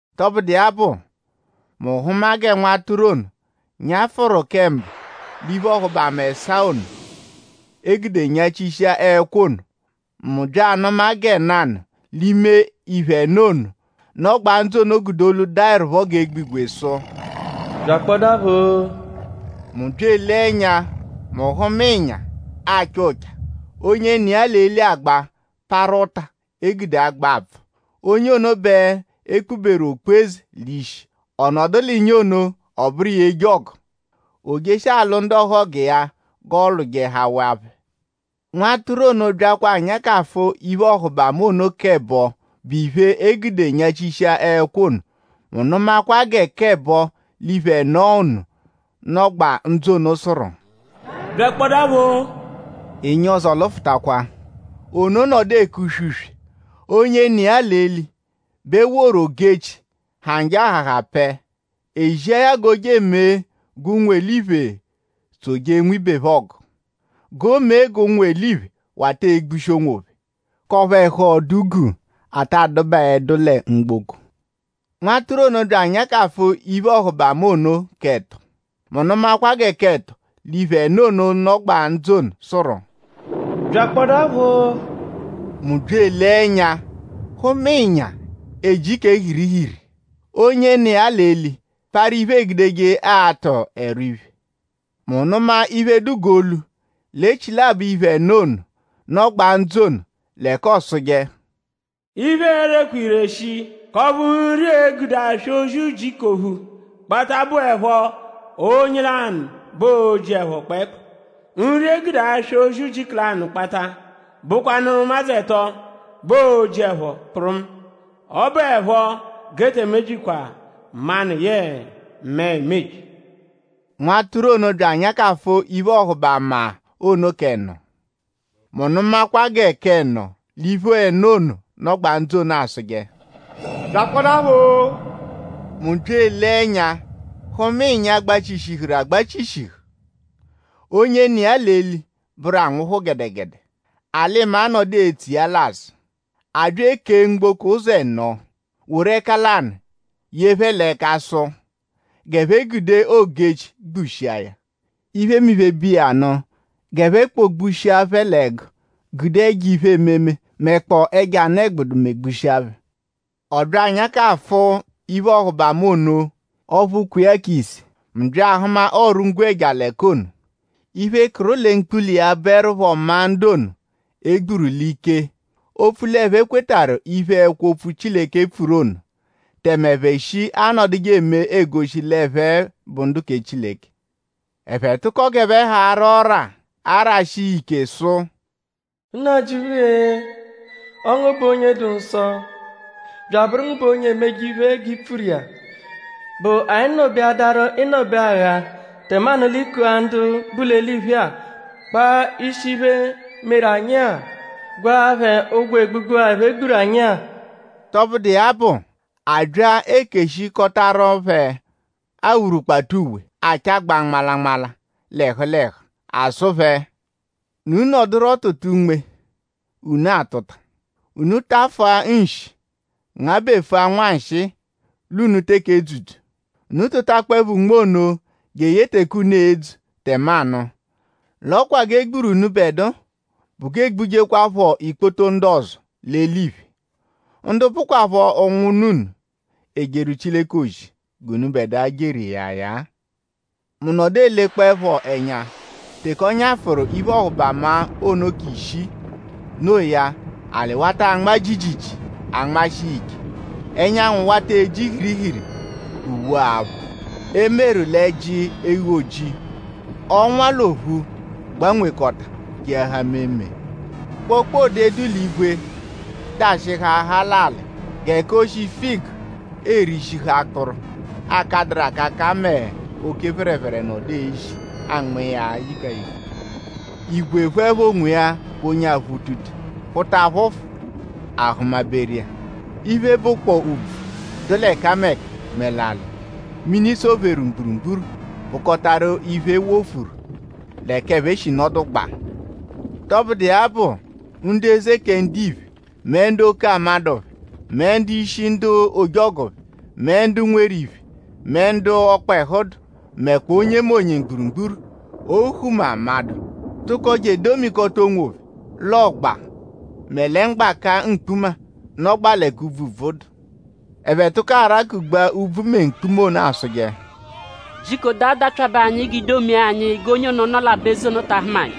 Tọbudu iya bụ; mu hụma gẹ Nwatụru ono nyafụru kẹ mbụ l'iphe-ọhubama ẹsaa ono, e gude nyachishia ẹkwo ono. Mu bya anụma gẹ nanụ l'ime iphe ẹno ono, nọgbaa ndzụ ono gude olu, daẹrupho g'egbigwe sụ: “Byakpọdaapho-o!” Mu bya elee ẹnya; mu hụma ịnya, acha ụcha. Onye nọ iya l'eli agba parụ ụta, eegudeje agba apfụ. Onye ono bẹ e kpuberu okpu-eze l'ishi. Ọ nọdu l'ịnya ono; ọ bụru iya eje ọgu. O jeshia alwụ ndu ọhogu iya g'ọolwujehawaa phẹ. Nwatụru ono byakwa anyakafụ iphe-ọhubama ono k'ẹbo bụ iphe, e gude nyachishia ẹkwo ono. Mu nụmakwa gẹ k'ẹbo l'iphe ẹno ono, nọgbaa ndzụ ono sụru: “Byakpọdaapho-o!” Ịnya ọzo lụfutakwa. Ono nọdu eke uswe-uswe. Onye nọ iya l'eli bẹ e woru ogu-echi, ha njọ ahaha pẹe. E zia ya g'o je emee g'ụnwu-eliphe tsoje ibe phẹ ọgu; g'o mee g'ụnwu-eliphe wata egbushi onwophẹ; k'ọphu ẹhu ọdu guu ata adụbaedu lẹ mgboko. Nwatụru ono byakwa anyakafụ iphe-ọhubama ono k'ẹto. Mu nụmakwa gẹ k'ẹto l'iphe ẹno ono, nọgbaa ndzụ ono sụru: “Byakpọdaapho-o!” Mu bya elee ẹnya hụma ịnya, eji kẹ hirihiri. Onye nọ iya l'eli parụ iphe, eegudeje atụ̀ ẹrwa iphe. Mu nụma iphe, dụ g'olu l'echilabọ iphe ẹno ono, nọgbaa ndzụ ono l'ẹka ọosuje: “Iphe e-rekwa ire shii; k'ọphu nri, e gude aswa ozi ujiku ophu kpata bụepho onye lanụ bẹ oo-ji ẹpho kpẹekpu. Nri, e gude aswa ozi ujiku lanụ kpata bụkwanuru ụmadzu ẹto bẹ oo-ji ẹpho kpụrumu. Ọ bụepho g'e te emebyikwa manụ yẹe mẹe emebyi.” Nwatụru ono byakwa anyakafụ iphe-ọhubama ono k'ẹno; mu nụmakwa gẹ k'ẹno l'iphe ẹno ono, nọgbaa ndzụ ono asụje: “Byakpọdaapho-o!” Mu bya elee ẹnya hụma ịnya, gbachishihuru agbachishihu. Onye nọ iya l'eli bụru Anwụhu gẹdegede. Alị-maa nọdu etso iya l'azụ. A bya ekee mgboko ụzo ẹno; woru ẹka lanụ ye phẹ l'ẹka; sụ g'ẹphe gude ogu-echi gbugbushia iphemiphe bu iya nụ; g'ẹphe kpọ-gbushia phẹ l'ẹgu; gude ẹjo iphe-ememe mẹkpoo ẹjo anụ-ẹgbudu megbushia phẹ. Ọ byakwa anyakafụ iphe-ọhubama ono ọphu kwe iya ise. Mu bya ahụma ọru-ngwẹja l'ẹka ono. Iphe, kụru lẹ mkpula iya bụerupho maa ndu ono, e gburu l'ike opfu l'ẹphe kwetarụ iphe, ẹkwo-opfu Chileke pfuru ono; tẹme ẹphe shi anọduje eme egoshi l'ẹphe bụ ndu kẹ Chileke. Ẹphe tụko g'ẹphe ha ara ọ́rà arashi iya ike sụ: “Nnajịuphu-e! Ọo ngu bụ onye dụ nsọ; bya abụru ngu bụ onye emeje iphe, g'i pfuru iya.?Bụ anyi nọ-beadaru ịno-beagha tẹmanu l'i kua ndu bu l'eliphe kpaa ishi iphe, meru anyi-a; gwaa phẹ ụgwo egbugbu-a, ẹphe gburu anyi-a?” Tọbudu iya bụ; a bya ekeshikọtaru phẹ awurukpata uwe, achagbaa nmalanmala l'ẹhu l'ẹhu. A sụ phẹ: “Unu nọduro tụtaro unme, unu atụta. Unu tafụa nshi ngabẹfua nwanshịi l'unu teke edzudu. Unu tụtakpoepho unme ono jeye teke unu e-dzu tẹmanu. L'ọ kwa g'e gburu unubẹdua bụ g'e gbujekwaphọ ikpoto ndu ọzo l'eliphe; ndu bụkwapho ụnwunna unu, ejeru Chileke ozi g'unubẹdua jeru iya ya-a.” Mu nọdu elekpọepho ẹnya teke ọ nyafụru iphe-ọhubama ono k'ishii. Noo ya; alị wata anma jiijiijii anmashi iya ike; ẹnyanwu wata eji hirihiri g'uwe-aphụ, e meru l'ẹ́jí eghu-ojii. Ọnwa l'ophu gbanwekọta keahaa meemee. Kpokpode, dụ l'igwe dashịhuaha l'alị g'ẹka oshi figu erishihu akpụru, akadụru akaka mẹ oke phẹrephere nọdu ezi anma iya yiga yiga. Igwe phụepho onwiya g'onye aphụ utute phụta phụfu; a hụma-beru iya. Iphe, bụkpoo úbvú, dụ l'ẹkameka; mẹ alị, mini sọ-pheru mgburugburu bụkotaru iphe, e wofuru l'ẹka ẹphe shi nọdugbaa. Tọbudu iya bụ; ndu eze kẹ ndiphe; mẹ ndu oke amadụ phẹ; mẹ ndu-ishi ndu ojọgu phẹ; mẹ ndu nweru iphe; mẹ ndu ọkpehu dụ; mẹkpoo onyemonye mgburugburu; ohu mẹ amadụ; tụko je edomikọta onwophẹ l'ọgba mẹ lẹ mgbaka mkpuma, nọgbaa l'ẹka úbvú dụ. Ẹphe tụko arakugbaa úbvú mẹ mkpuma ono asụje: “Jiko daa dapyabe anyi g'ii-domia anyi g'onye ono, nọ l'aba-eze ono ta ahụma anyi;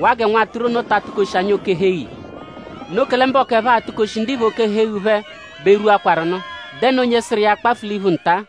waa gẹ Nwatụru ono ta atụ-koshi anyi oke-ẹhu-eghu iya. Noo kẹle mbọku ẹphe atụkoshi ndiphe oke ẹhu-eghu phẹ bẹ rwuakwaru nụ.?Dẹnu onye sụru iya akpafụ l'iphu nta?”